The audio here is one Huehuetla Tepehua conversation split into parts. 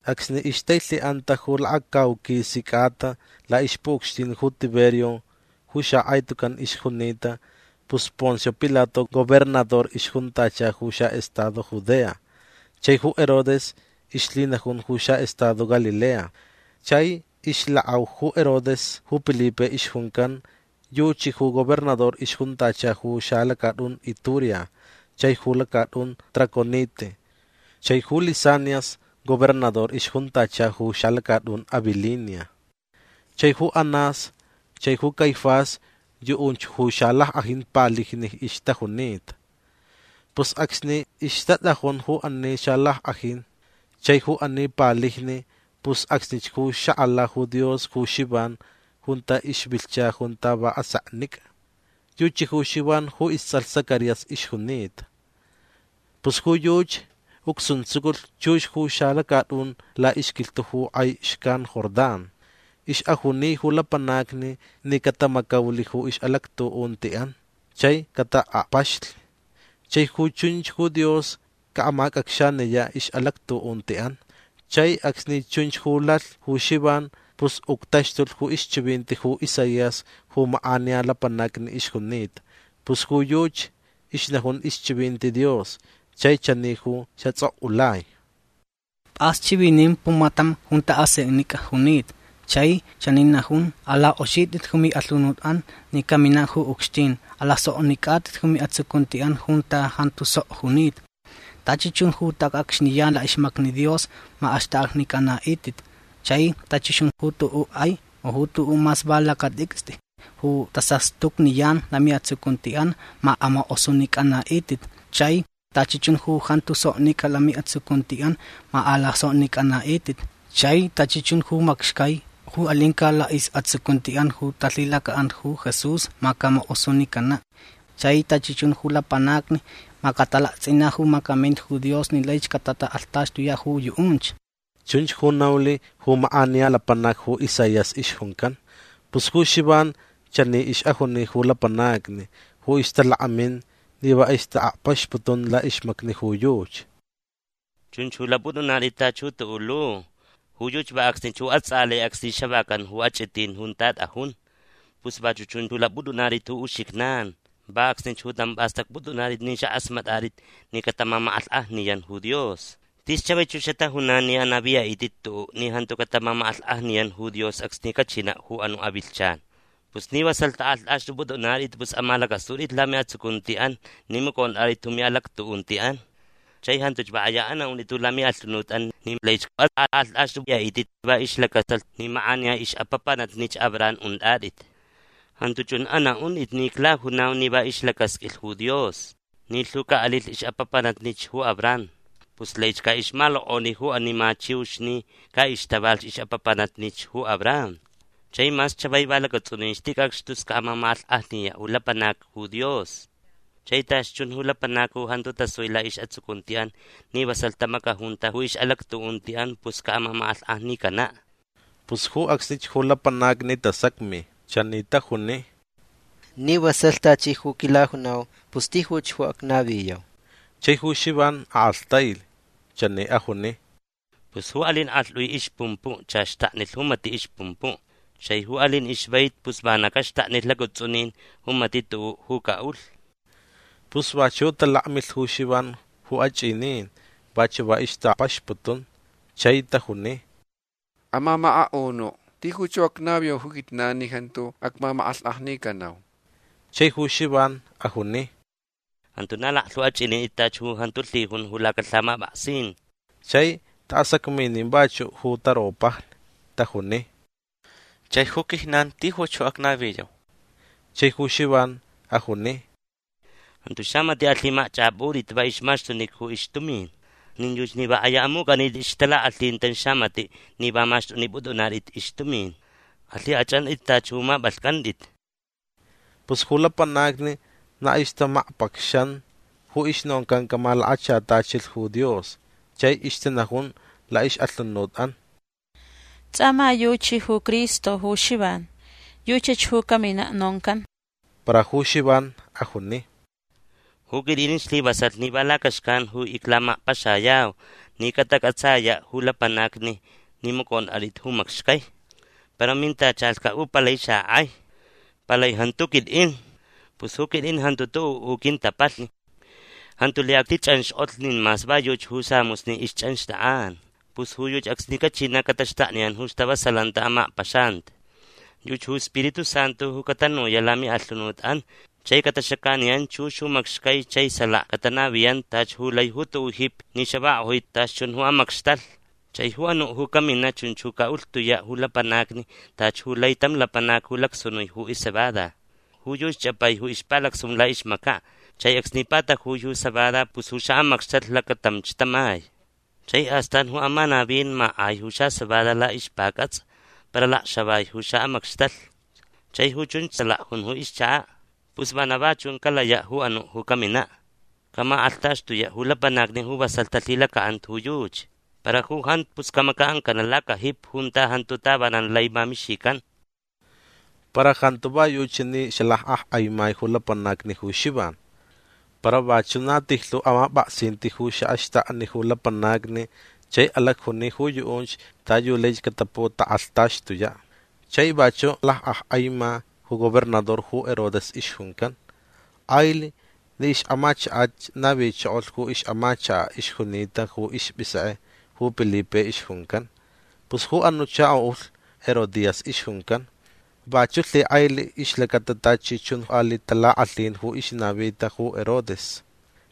Acsni ixtailhiʼanta ju lakacauquisi cʼata laʼixpuʼucxtin ju Tiberio ju xakʼai tucan ixjunita pus Poncio Pilato gobernador ixjuntacha ju xaʼestado Judea. Chai ju Herodes ixlhinajun ju xaʼestado Galilea. Chai ixlakʼau ju Herodes ju Pilipe ixjuncan yuchi ju gobernador ixjuntacha ju xalacatʼun Iturea chai ju lacatʼun Traconite. Chai ju Lisanias gobernador ixjuntacha ju xalacatʼun Abilinia. Chai ju Anás chai ju Caifás yuʼunch ju xalackʼajin palijni ixtajunita. Pus acsni ixtatʼajun ju ani xalackʼajin chai ju ani palijni pus acsnich ju xakʼala ju Dios ju Xivan junta ixvilhcha junta va aseknicʼa. Yuchi ju Xivan ju istsʼalh Zacarías ixjunita. Pus ju yuchi ucsuntsuculh chux ju xalacatʼun laʼixquilhtuʼ ju kʼai xcan Jordán. Ixʼajuni ju lapanacni ni catamacaulh ju ixʼalactuʼuntiʼan chai cataʼakpaxlh. Chai ju chunch ju Dios caʼamacʼacxaniyaʼ ixʼalactuʼuntiʼan. Chai acsni chunch ju lalh ju Xivan pus uctaxtulh ju ixchivinti ju Isaías ju makʼaniya lapanacni ixjunita. Pus ju yuchi ixnajun ixchivinti Dios chai chani ju xatsʼokʼulai: Pʼas chivinin pumatam junta aseknicʼa junita. Chai chani najun: “Alakʼoxitʼit ju miʼalhunutʼan ni caminaʼ ju ucxtin. Alasoknicʼatʼit ju miʼatsucuntiʼan junta jantu sok junita. Tachi chun ju tacʼacxniyan laʼixmacni Dios ma axtʼaknicʼanaʼitʼit. Chai tachi chun ju tuʼuʼ kʼai u ju tuʼuʼ mas va lacatʼicstʼi ju tasastucniyan lamiʼatsucuntiʼan ma amakʼosunicʼanaʼitʼit. Chai tachi chun ju jantu soknicʼa lamiʼatsucuntiʼan ma alasoknicʼanaʼitʼit. Chai tachi chun ju macxcai ju alincaʼ laʼisʼatsucuntiʼan ju talhilacaʼanta ju Jesús ma camakʼosunicanaʼ. Chai tachi chun ju lapanacni ma catalaktsʼinaʼ ju macaminta ju Dios ni laich catatakʼalhtaxtuyaʼ ju yuʼunch”. Chunch ju naulh ju makʼaniya lapanac ju Isaías ixjuncan. Pus ju Xivan chani ixʼajuni ju lapanacni ju ixtalakmin ni va ixtaʼakpaxputun laʼixmacni ju yuchi: ―Chunch ju lapʼutʼunatʼit tachi ju tuʼuʼ lu. Ju yuchi va acsnich ju atsʼalai acsni xavacan ju achʼitin junta tʼajun. Pus vachuʼ chun ju lapʼutʼunatʼit ju uxijnan. Va acsnich ju tamch pʼastʼacpʼutʼunatʼit ni xakʼasmatʼatʼit ni catamamakʼalhkʼajniyan ju Dios. Tis chavaich ju xatajunan ni anaviyaʼitʼit tuʼuʼ ni jantu catamamakʼalhkʼajniyan ju Dios acsni cachinaʼ ju anuʼ avilhchan. Pus ni vasalh tʼakʼalhtʼaxtʼupʼutʼunatʼit pus amalacʼasutʼit lamiʼatsucuntiʼan ni macʼontʼatʼit ju miʼalactuʼuntiʼan. Chai jantuch va kʼaya anaʼuntʼit ju lamiʼalhunutʼan ni laich atʼakʼalhtʼaxtʼuyaʼitʼit va ixlacaʼatalh ni makʼaniya ixʼapapanatnich Abraham untʼatʼit. Jantu chun anaʼuntʼit ni iclajunau ni va ixlacasqʼuilh ju Dios ni lhu caʼalilh ixʼapapanatnich ju Abraham pus laich caʼixmalokʼoni ju ani ma chiux ni caʼixtava ixʼapapanatnich ju Abraham. Chai mas chavai va lacatsʼunin ticʼacx tus caʼamamakʼalhkʼajniyaʼ ju lapanacni ju Dios. Chai tachi chun ju lapanacni ju jantu tasui laʼisʼatsucuntiʼan ni vasalh tamacajunta ju ixʼalactuʼuntiʼan pus caʼamamakʼalhkʼajnicanaʼ. Pus ju acsnich ju lapanacni tasacmi. Chani tajuni: ―Ni vasalh tachi ju quilajunau pus tijuch ju acnaviyau. Chai ju Xivan akʼalhtailh. Chani ajuni: ―Pus ju alin kʼalhtʼui ixpumpuʼ chach xtaknilh ju matiʼ ixpumpuʼ. Chai ju alin ixvaiti pus vana caxtaknilh lacatsʼunin ju matiʼ tuʼuʼ ju caʼulh. Pus vachuʼ talakmilh ju Xivan ju achʼinin. Vachuʼ va ixtaʼakpaxputun. Chai tajuni: ―Amamakaʼunuʼ tijuch ju acnaviyau ju quijnan ni jantu acmamakʼalhkʼajnicanau. Chai ju Xivan ajuni: ―Jantu na laklhu achʼinintʼit tachi ju jantu lhijun ju lacalhamapʼaksin. Chai taʼasacminin vachuʼ ju taropajni. Tajuni: ―Chai ju quijnan tijuch ju acnaviyau. Chai ju Xivan ajuni: ―Jantu xamatiʼ alhimacchʼapʼutʼit va ixmaxtunica ju ixtumin. Nin yuchi ni va kʼaya amucʼanitʼit ixtalakʼalhin tam xamatiʼ ni va maxtʼupʼutʼunatʼit ixtumin. Alhikʼachʼantʼit tachi ju mapʼalhcʼantʼit. Pus ju lapanacni na ixtamakpacxan ju ixnoncan camalakachatachilh ju Dios. Chai ixtanajun laʼixʼalhunutʼan: “Tsʼa ma yuchi ju Cristo ju Xivan. Yuchach ju caminaʼ noncan”. Para ju Xivan ajuni: ―Ju quitʼin islivasalh ni va lacaxcan ju iclamakpaxayau ni catacʼatsayaʼ ju lapanacni ni macʼontʼatʼit ju macxcai. Para mintachalhcaʼ ju palai xakʼai. Palai jantu ju quitʼin. Pus ju quitʼin jantu tuʼuʼ ju quintapalhni. Jantu lai actichʼanxkʼotlh nin mas va yuchi ju samusni ixchʼanxtʼakʼan. Pus ju yuchi acsni cachinaʼ cataxtakniyan ju stavasalanti amakpaxanti. Yuchi ju Spiritu Santu ju catanuyaʼ lamiʼalhunutʼan chai cataxacaniyan chux ju macxcai chai salaka catanaviyan tachi ju lai ju tuʼuʼ jipi ni xavakʼojui tachi chun ju amacxtalh. Chai ju anuʼ ju caminaʼ chunch ju caʼulhtuyaʼ ju lapanacni tachi ju lai tam lapanac ju lacsunui ju iscebada. Ju yuchi chʼapai ju ixpalacsunun laʼixmacaʼ chai acsni patajui ju cebada pus ju xaʼamacxtalh lacatamch tamai. Chai astan ju amanavin makʼai ju xacebada laʼixpacʼatsʼa para alacxavai ju xaʼamacxtalh. Chai ju chunch salaka jun ju ixchakaʼ. Pus vana va chun calayaʼ ju anuʼ ju caminaʼ. Camakʼalhtaxtuyaʼ ju lapanacni ju vasalh talhilacaʼanta ju yuchi. Para ju jantu pus camacaʼancanaʼ lacajipi junta jantu tavanan lai mamixican. Para jantu va yuchi ni xalakʼakʼaimai ju lapanacni ju Xivan. Para vachuʼ na tijlhu amapʼaksinti ju xaʼaxtakni ju lapanacni chai alacjuni ju yuʼunch ta yu laich cataputakʼalhtaxtuyaʼ. Chai vachuʼ lakʼakʼaima ju gobernador ju Herodes ixjuncan. Kʼailh ni ixʼamachakach navichokolh ju ixʼamachakaʼ ixjunita ju ispʼisekʼe ju Pilipe ixjuncan. Pus ju anuʼ chakoʼulh Herodías ixjuncan. Vachuʼ lhikʼailh ixlacata tachi chun aliʼ talakʼalhin ju ixnavita ju Herodes.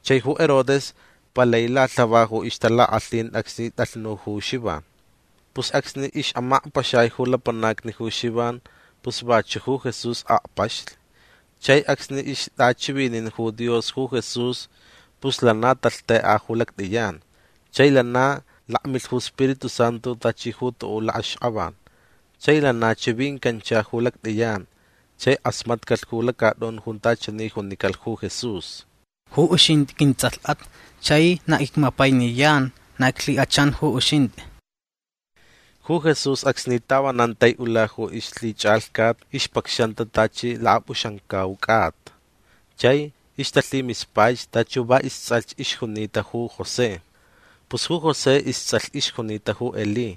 Chai ju Herodes palai lalhava ju ixtalakʼalhin acsni tʼalhnu ju Xivan. Pus acsni ixʼamakpaxai ju lapanacni ju Xivan pus vachuʼ ju Jesús akpaxlh. Chai acsni ixtʼachivinin ju Dios ju Jesús pus lana talhtʼekʼa ju lactʼiyan. Chai lana lakmilh ju Spiritu Santu tachi ju tuʼuʼ lakʼaxkʼavan. Chai lana chivincancha ju lactʼiyan chai kʼasmatcalh ju lacatʼun junta chani junicalh ju Jesús: ―Ju uxintʼi quintsʼalhʼat. Chai na icmapainiyan. Na iclhikʼachan ju uxintʼi. Ju Jesús acsni tavanan taiʼula ju ixlhichʼalhcat ixpacxanta tachi lakapʼuxamcau cʼata. Chai ixtalhimispaich tachi ju va istsʼalh ixjunita ju José. Pus ju José istsʼalh ixjunita ju Elí.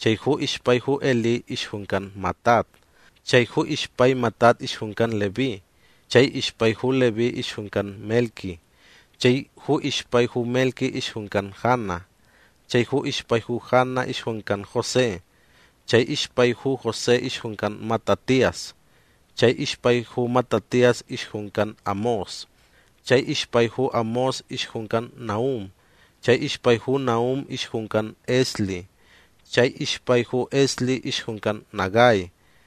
Chai ju ixpai ju Elí ixjuncan Matat. Chai ju ixpai Matat ixjuncan Leví. Chai ixpai ju Leví ixjuncan Melqui. Chai ju ixpai ju Melqui ixjuncan Jana. Chai ju ixpai ju Jana ixjuncan José. Chai ixpai ju José ixjuncan Matatías. Chai ixpai ju Matatías ixjuncan Amós. Chai ixpai ju Amós ixjuncan Nahum. Chai ixpai ju Nahun ixjuncan Esli. Chai ixpai ju Esli ixjuncan Nagai.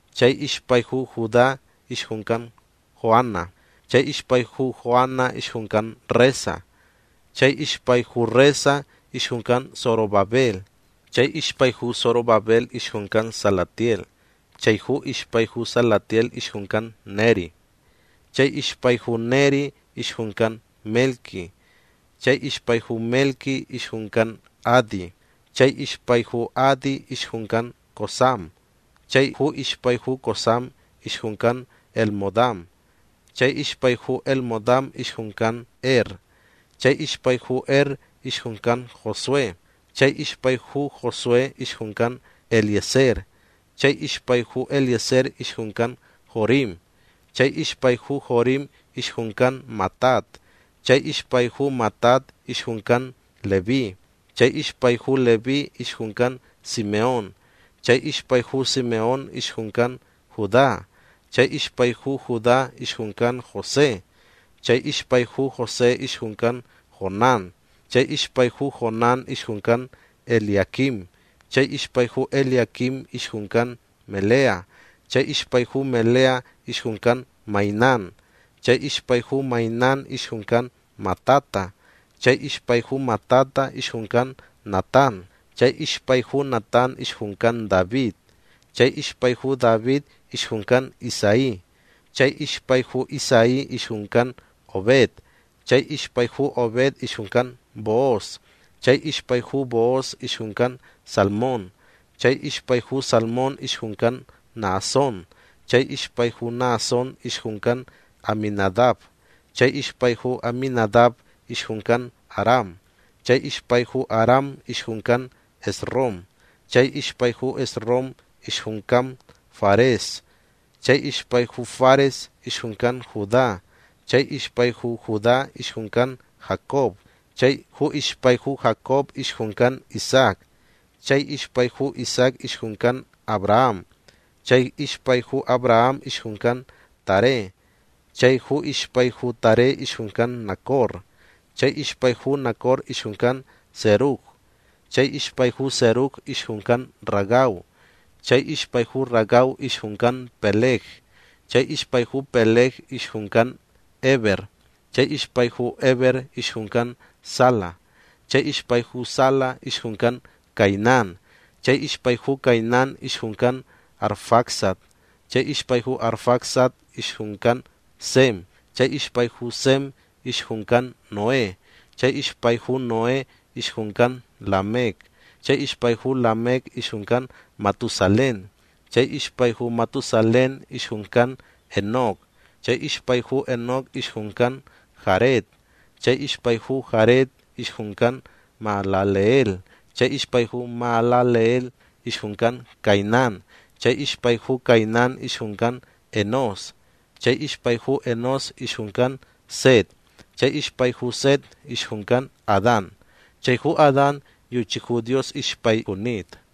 Chai ixpai ju Judá ixjuncan Joana. Chai ixpai ju Joana ixjuncan Resa. Chai ixpai ju Resa ixjuncan Zorobabel. Chai ixpai ju Zorobabel ixjuncan Salatiel. Chai ju ixpai ju Salatiel ixjuncan Neri. Chai ixpai ju Neri ixjuncan Melqui. Chai ixpai ju Melqui ixjuncan Adi. Chai ixpai ju Adi ixjuncan Cosam. Chai ju ixpai ju Cosam ixjuncan Elmodam. Chai ixpai ju Elmodam ixjuncan Er. Chai ixpai ju Er ixjuncan Josué. Chai ixpai ju Josué ixjuncan Eliezer. Chai ixpai ju Eliezer ixjuncan Jorim. Chai ixpai ju Jorim ixjuncan Matat. Chai ixpai ju Matat ixjuncan Leví. Chai ixpai ju Leví ixjuncan Simeón. Chai ixpai ju Simeón ixjuncan Judá. Chai ixpai ju Judá ixjuncan José. Chai ixpai ju José ixjuncan Jonán. Chai ixpai ju Jonán ixjuncan Eliaquim. Chai ixpai ju Eliaquim ixjuncan Melea. Chai ixpai ju Melea ixjuncan Mainán. Chai ixpai ju Mainán ixjuncan Matata. Chai ixpai ju Matata ixjuncan Natán. Chai ixpai ju Natán ixjuncan David. Chai ixpai ju David ixjuncan Isaí. Chai ixpai ju Isaí ixjuncan Obed. Chai ixpai ju Obed ixjuncan Booz. Chai ixpai ju Booz ixjuncan Salmón. Chai ixpai ju Salmón ixjuncan Naasón. Chai ixpai ju Naasón ixjuncan Aminadab. Chai ixpai ju Aminadab ixjuncan Aram. Chai ixpai ju Aram ixjuncan Esrom. Chai ixpai ju Esrom ixjuncan Fares. Chai ixpai ju Fares ixjuncan Judá. Chai ixpai ju Judá ixjuncan Jacob. Chai ju ixpai ju Jacob ixjuncan Isaac. Chai ixpai ju Isaac ixjuncan Abraham. Chai ixpai ju Abraham ixjuncan Taré. Chai ju ixpai ju Taré ixjuncan Nacor. Chai ixpai ju Nacor ixjuncan Serug. Chai ixpai ju Serug ixjuncan Ragau. Chai ixpai ju Ragau ixjuncan Peleg. Chai ixpai ju Peleg ixjuncan Heber. Chai ixpai ju Heber ixjuncan Sala. Chai ixpai ju Sala ixjuncan Cainán. Chai ixpai ju Cainán ixjuncan Arfaxad. Chai ixpai ju Arfaxad ixjuncan Sem. Chai ixpai ju Sem ixjuncan Noé. Chai ixpai ju Noé ixjuncan Lamec. Chai ixpai ju Lamec ixjuncan Matusalén. Chai ixpai ju Matusalén ixjuncan Enoc. Chai ixpai ju Enoc ixjuncan Jared. Chai ixpai ju Jared ixjuncan Mahalaleel. Chai ixpai ju Mahalaleel ixjuncan Cainán. Chai ixpai ju Cainán ixjuncan Enós. Chai ixpai ju Enós ixjuncan Set. Chai ixpai ju Set ixjuncan Adán. Chai ju Adán yuchi ju Dios ixpai junita.